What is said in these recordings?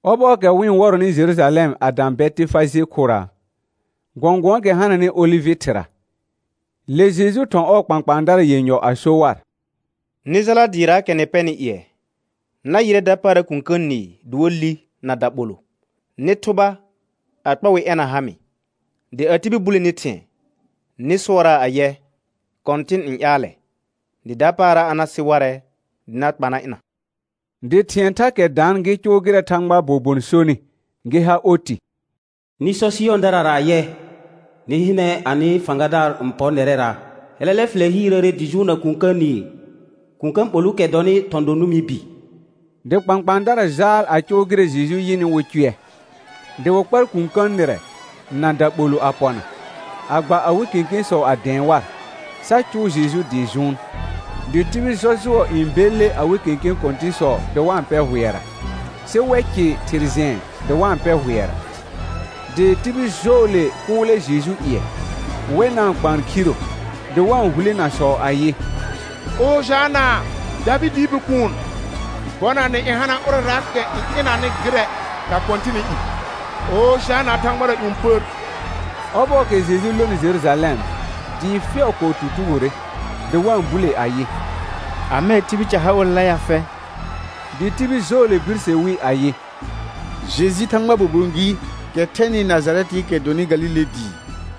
Ɔbɔɔkɛ wɩ-n wɔrɔnɩ Jerujalɛm a dã Bɛtɩfaje khʋra, gɔ̃gʋ̃ɔɔkɛ hananɩ olɩvɩ thɩra, le Jeju thɔ̃ ɔɔ kpãkpãadara yenyɔ a so war: Nɩ jala dɩɩraakɛ nɩ pɛnɩ ƴɩɛ. Na yɩrɛ dapaara kũkə̃ nɩɩ dɩ wa li na daɓolʋ. Nɩ thʋba a kpa wɩ ɛna ha mɩ. Dɩ a tibil bule ni thɩ̃ɛ, nɩ sʋɔraa ayɛ: Kɔ̃tɩn n ƴaalɛ; dɩ dapaara a na sɩ warɛ dɩ na kpa na ɩna. Dɩ thɩ̃ɛ thakɛ daan gɩ cʋʋ gɩrɛ Thãgbaa bobon sonɩ gɩ ha oti. «Nɩ sɔ Sɩyɔ̃dara ayɛ: Nɩ hɩnɛ anɩ fãgadaar n pɔr nɛrɛra. Hɛlɛlɛ fɩlɛ hiirəəre dɩ jʋʋnna kũkə̃ nɩɩ, kũkə̃ ɓolʋʋkɛ dɔnɩ thɔ̃ do nʋmɩ bi.» Dɩ kpãkpãadara jaal a cʋʋ gɩrɛ Jeju yɩnɩ wɩ cʋɛ. Dɩ wɩ kpar kũkə̃ nɩrɛ na daɓolʋ a pɔna, a gba awɩ kẽkẽsɔ a dɛ̃ɛ war, sa cʋʋ Jeju dɩ jʋʋn. Dɩ tibil jɔjʋɔ n belle awɩ kẽkẽ kɔ̃tɩ̃sɔ dɩ wa-n pɛ hʋɛra, sɩ wɛ cɩ thɩr jɛ̃ɛ dɩ wa-n pɛ hʋɛra. Dɩ tibil jɔɔle kʋʋlɛ Jeju ƴɩɛ, wɛ na-n kpaan khiro, dɩ wa-n hulenasɔ ayɩ: «Ojana, Davɩdɩɩ Bikuun. Bɔnanɛ n hana ʋrɛraakɛ n ɩnanɩ gɩrɛ na Kɔ̃tɩnɩ i. Ojana thãgbara ƴũ pər.» Ɔbɔɔkɛ Jeju lonɩ Jerujalɛm, dɩɩ fɛʋ kɔɔ tutugore, dɩ wa-n bule ayɩ: Amɛɛ tibil ca ha olela ya fɛ? Dɩ tibil jɔɔle birse wi ayɩ: Jeju Thãgbaa bobon gɩɩkɛ thɛnɩ Najarɛtɩɩkɛ dɔnɩ Galile dɩɩ.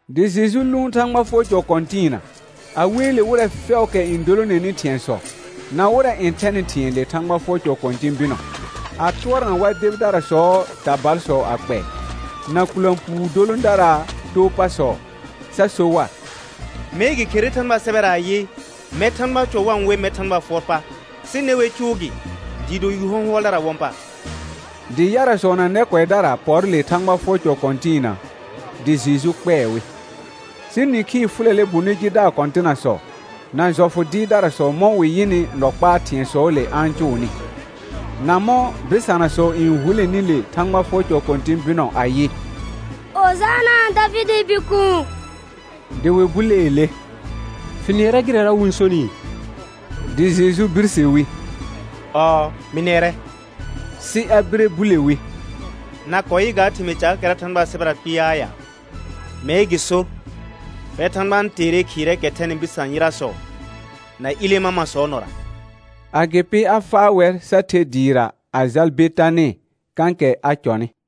Dɩ Jeju lʋʋn Thãgba fʋɔr cɔ kɔ̃tɩɩna. A weele wɩrɛ fɛʋʋkɛ n dolonenɩ thɩ̃ɛsɔ, na wɩrɛ n thɛnɩ thɩ̃ɛ le Thãgba fʋɔr cɔ kɔ̃tɩ̃ bɩnɔ, a tʋɔrna war debidarasɔɔ tabalsɔ a kpɛɛ, na kʋlã puu dolõdaraa too pasɔ, sa so war: Mee gɩ kherere Thãgbaa sɛbɛra ayɩ: «Mɛr Thãgbaa cɔ wa-n we mɛr Thãgbaa fʋɔr pa», sɩ dɩ ne wer cʋʋ gɩ dɩɩ do yu hɔ̃hʋɔldaraa wɔ̃ pa. Dɩ yarasɔ na nɛ kʋɛdara pɔr le Thãgba fʋɔr cɔ kɔ̃tɩɩna, dɩ Jeju kpɛɛ wɩ. Sɩ nĩkhii fʋlɛlɛ bonɩ jidaar kɔ̃tɩnasɔ, na jɔfʋ dɩɩrdarasɔ mɔ̃ wɩ yɩnɩ nɔ kpaa thɩ̃ɛsɔɔle a-n cʋʋnɩ, na mɔ̃ bɩsanasɔ n huleni le Thãgba fʋɔr cɔ kɔ̃tɩ̃ bɩnɔ ayɩ: Ojana, Davɩdɩɩ Bikuun. Dɩ wɩ buleele: Fɩ nɩɛrɛ gɩrɛra wɩ-n sonɩɩ? Dɩ Jeju birse wi: Ɔɔ, mɩ nɩɛrɛ. Sɩ a bire bule wi: Na kɔɔ yɩ ga thɩmɩɩ caakɛra Thãgbaa sɛbɛra kpɩɩaa ya? Mee gɩ sor: «Fɛr Thãgba n teere khɩɩrɛɛkɛ thɛnɩ bɩsã yɩrasɔ na ilẽ mamasɔɔ nɔra.» Agɩpɩ a faa wɛr sa the dɩɩra a jal Betanɩ, kãkɛ a cɔnɩ.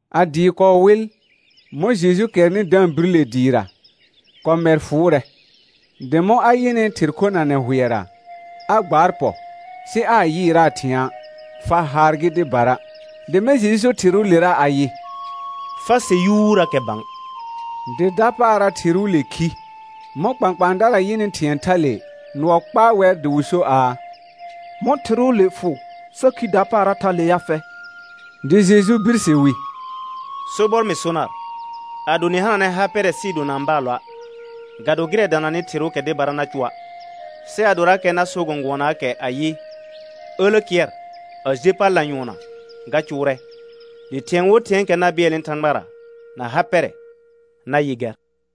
A dɩɩ kɔɔ wɩl, mɔ̃ Jeju kɛrnɩ da-n bir le dɩɩra, kɔmɛr fʋʋrɛ. Dɩ mɔ̃ a yɩnɩ thɩr khonanɛ hʋɛra, a gbaar pɔ, sɩ aa yɩɩraa thɩ̃a', fa haar gɩ dɩbara. Dɩ mɛ̃ Jeju so thɩrʋʋlera ayɩ: Fa se yuurakɛ bã. Dɩ dapaara thɩrʋʋle khi. Mɔ̃ kpãkpãadara yɩnɩ thɩ̃ɛ thale, nʋɔ kpaa wɛr dɩ wɩ so aa: Mɔ̃ thɩrʋʋle fʋ sa khi dapaara thale ya fɛ? Dɩ Jeju birse wi: Sobɔr mɩ so nar, ado nɩ hananɛ ha pɛrɛ sɩɩ do na-n baalɔa', ga do gɩrɛ dananɩ thɩrʋʋkɛ dɩbara na cʋa', sɩ adorakɛ na so gɔ̃gʋɔnaakɛ ayɩ: Ǝlə kɩɛr a je pal lanyʋɔnna ga cʋʋrɛ. Dɩ thɩ̃ɛ wo thɩ̃ɛɛkɛ na bɩɛlnɩ Thãgbara na ha pɛrɛ, na yɩ gɛr.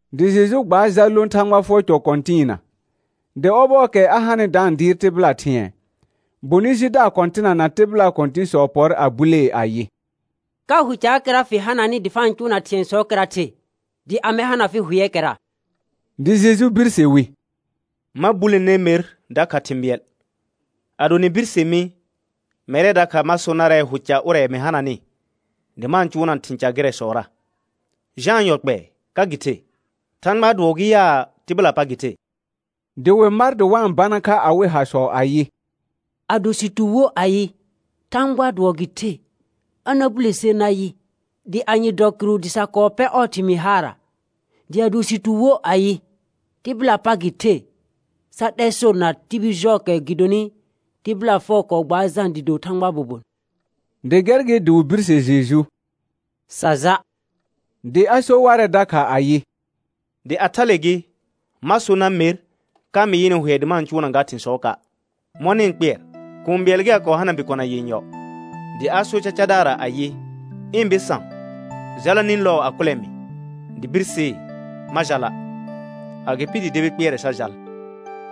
Dɩ Jeju gbaar jal lõ Thãgba fʋɔr cɔ kɔ̃tɩɩna, dɩ ɔbɔɔkɛ a hanɩ da-n dɩɩr tɩbɩla thɩ̃ɛ, bonɩ jidaar kɔ̃tɩna na tɩbɩlaa kɔ̃tɩ̃sɔ pɔr a bulee ayɩ: Ka hʋ caakɛra fɩ hananɩ dɩ fa-n cʋʋna thɩ̃ɛsɔɔkɛra the, dɩ amɛ hana fɩ hʋɛɛkɛra? Dɩ Jeju birse wi: Ma bule ner mer dakha thɩ̃ bɩɛl. Ado nɩ birse mi, mɛrɛ dakha ma so narɛ hʋ ca ʋrɛ mɩ hananɩ, dɩ ma-n cʋʋna thɩ̃ ca gɩrɛsɔra. Jãa yɔ kpɛɛ, ka gɩ the? Thãgbaa dʋɔ gɩ yaa, tɩbɩlaa pa gɩ the? Dɩ wɩ mar dɩ wa-n bana kha awɩ hasɔ ayɩ: Ado sɩ tu wo ayɩ: Thãgbaa dʋɔ gɩ the, a na bule ser nayɩ, dɩ anye dɔ kɩrʋ dɩ sa kɔɔ pɛ ɔɔ thɩmɩɩ haara? Dɩ ado sɩ tu wo ayɩ: Tɩbɩlaa pa gɩ the, sa 'lɛr sor na tibil jɔɔkɛ gɩdonɩ tɩbɩla fɛʋ kɔɔ gbaar Jã dɩ do Thãgbaa bobon. Dɩ gɛr gɩ dɩ wɩ birse Jeju: Sa ja'. Dɩ a so warɛ dakha ayɩ: Dɩ a thale gɩ, ma so nar mer ka mɩ yɩnɩ hʋɛ dɩ ma-n cʋʋna ga thɩ̃sɔɔka'. Mɔ̃ nɩ-n kpɩɛr? Kũu bɩɛl gɩ a kɔɔ hana bikona yenyɔ, dɩ a sor cacadaarra ayɩ: Ɩ̃ bɩsã, jala nĩ lɔɔ a kʋlɛ mɩ. Dɩ birsee: Ma jala'; agɩpɩ dɩ debi kpɩɛrɛ sa jal.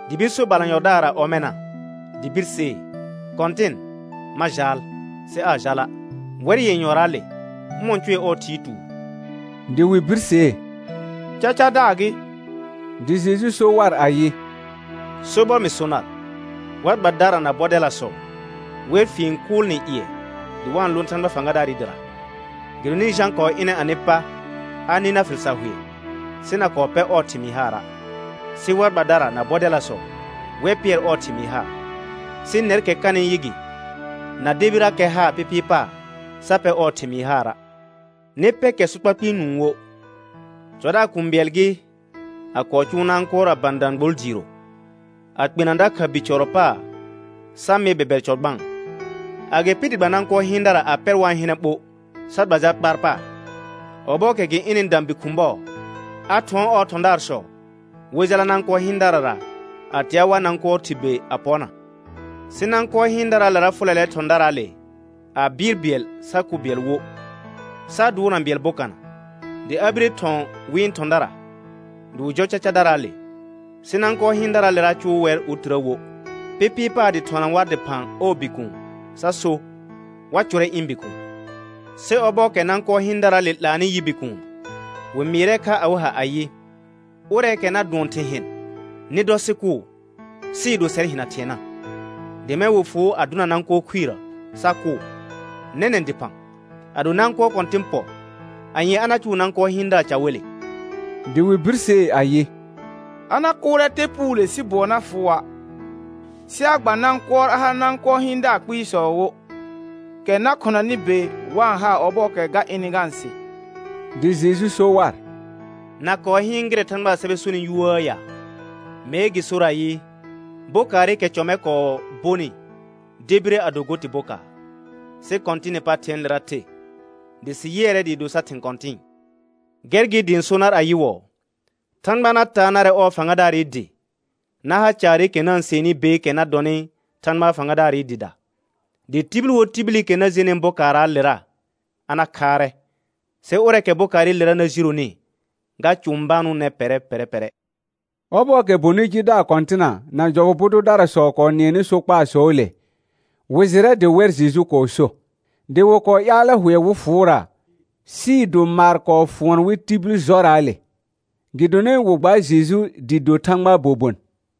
Dɩ bir so balanyɔdaarra ɔmɛna. Dɩ birsee: Kɔ̃tɩn, ma jaal, sɩ aa jala'. Wɛr yenyɔraale, ʋmɔ̃ cʋɛ ɔɔ thɩɩ tuur? Dɩ wɩ birsee: Cacadaar gɩ. Dɩ Jeju so war ayɩ: Sobɔr mɩ so nar, war gbadara na bɔdɛlasɔ, wɛr fien kʋʋl nɩ ƴɩɛ dɩ wa-n lõ Thãgba fãgadaarɩ dɩra. Gɩdonɩ Jã kɔɔ ɩnɛ anɩ pa a nɩ nar fɩl sar hʋɛ, sɩ na kɔɔ pɛ ɔɔ thɩmɩɩ haara'; sɩ war gbadara na bɔdɛlasɔ wɛr pɩɛr ɔɔ thɩmɩɩ haar, sɩ nɛrkɛ kanɩ yɩ gɩ, na debirakɛ haar pɩpɩɩ paar sa pɛ ɔɔ thɩmɩɩ haara'. Nɩ pɛ kɛ sokpa kpɩɩ nũu wo. Cɔdaar kũu bɩɛl gɩ, a kɔɔ cʋʋ nãkʋɔr a bã dãgbol diiro, a kpena dakha bi cɔrɔ paar sa mɩ bɛbɛr cɔ gbãa. Agɩpɩ dɩ gba nãkʋɔr hɩɩndara a pɛr wa-n hɩnɛ ɓo, sa gba jal kpaar paar. Ɔbɔɔkɛ gɩ ɩnɩ dã bi khʋ̃ bɔɔ, a thʋɔn ɔɔ thɔ̃daarsɔ wɩ jala nãkʋɔr hɩɩndarara, a tea war nãkʋɔr thɩr be a pɔna. Sɩ nãkʋɔr hɩɩndaraalera fʋlɛlɛ thɔ̃daraale, a bɩɩr bɩɛl sa kʋ bɩɛl wo, sa dʋʋrna bɩɛl bokana. Dɩ a bire thɔ̃ wɩ̃ thɔ̃dara dɩ wɩ jɔ cacadaraale, sɩ nãkʋɔr hɩɩndaraalera cʋʋ wɛr otirə wo. Pɩpɩɩ paar dɩ thɔna war dɩphã ɔɔ bikuun sa so: Wa cʋrɛ ɩ̃ bikuun. Sɩ ɔbɔɔkɛ nãkʋɔr hɩɩndaraale 'laanɩ yɩ bikuun, wɩ mɩɩrɛ kha awɩ ha ayɩ: Ʋrɛɛkɛ na dʋɔn thɩ̃ hɩn, nɩ dɔ sɩ kʋʋ, sɩɩ do sɛr hɩna thɩɛna. Dɩ mɛ̃ wɩ fʋʋ a dʋna nãkʋɔr khuirə sa kʋʋ. Nɛnɛ̃ dɩphã, ado nãkʋɔr kɔ̃tɩn pɔ, anye a na cʋʋ nãkʋɔr hɩɩndaar ca wele? Dɩ wɩ birsee ayɩ: A na kʋʋrɛ te puule sɩ bʋɔ na fʋʋa', sɩ a gba nãkʋɔr a ha nãkʋɔr hɩɩndaar kpɩɩsɔ wo, kɛ na khʋnanɩ be wa-n haa ɔbɔɔkɛ ga ɩnɩ ga-n se. Dɩ Jeju so war: Na kɔɔ hɩɩn gɩrɛ Thãgbaa sɛbɛ sonɩ yuuəə ya? Mee gɩ sor ayɩ: «Bokaarɩkɛ cɔ mɛ kɔɔ bonɩ debire a do go tɩ bokaar. Sɩ Kɔ̃tɩnɩ pa thɩ̃ɛɛlera the, dɩ sɩ yɩɛrɛ dɩɩ do sar thɩ̃ kɔ̃tɩ̃ɩ.» Gɛr gɩ dɩ ɩ̃ so nar ayɩwɔɔ: Thãgba na taa narɛ ɔɔ fãgadaarɩ dɩ na ha caarɩkɛ na-n sɩɛnnɩ beekɛ na dɔnɩ Thãgba fãgadaarɩ dɩda. [Dɩ tibil wo tibilikɛ na jenɩ bokaarraalera a na khaarɛ; sɩ ʋrɛɛkɛ bokaarɩlera na jironi ga cʋ̃banʋʋnɛ pɛrɛ pɛrɛ pɛrɛ.] Ɔbɔɔkɛ bonɩ jidaar kɔ̃tɩna na jɔfʋ bu dʋdarasɔ kɔɔ nɩɛnɩ sokpaasɔɔle, wɩ jɩrɛ dɩ wɛr Jeju kɔɔ so. Dɩ wɩ kɔɔ ƴaalɛ hʋɛ wɩ fʋʋra, sɩɩ do maar kɔɔ fʋɔn wɩ tibil jɔraale, gɩdonɩ wɩ gbaar Jeju dɩ do Thãgbaa bobon.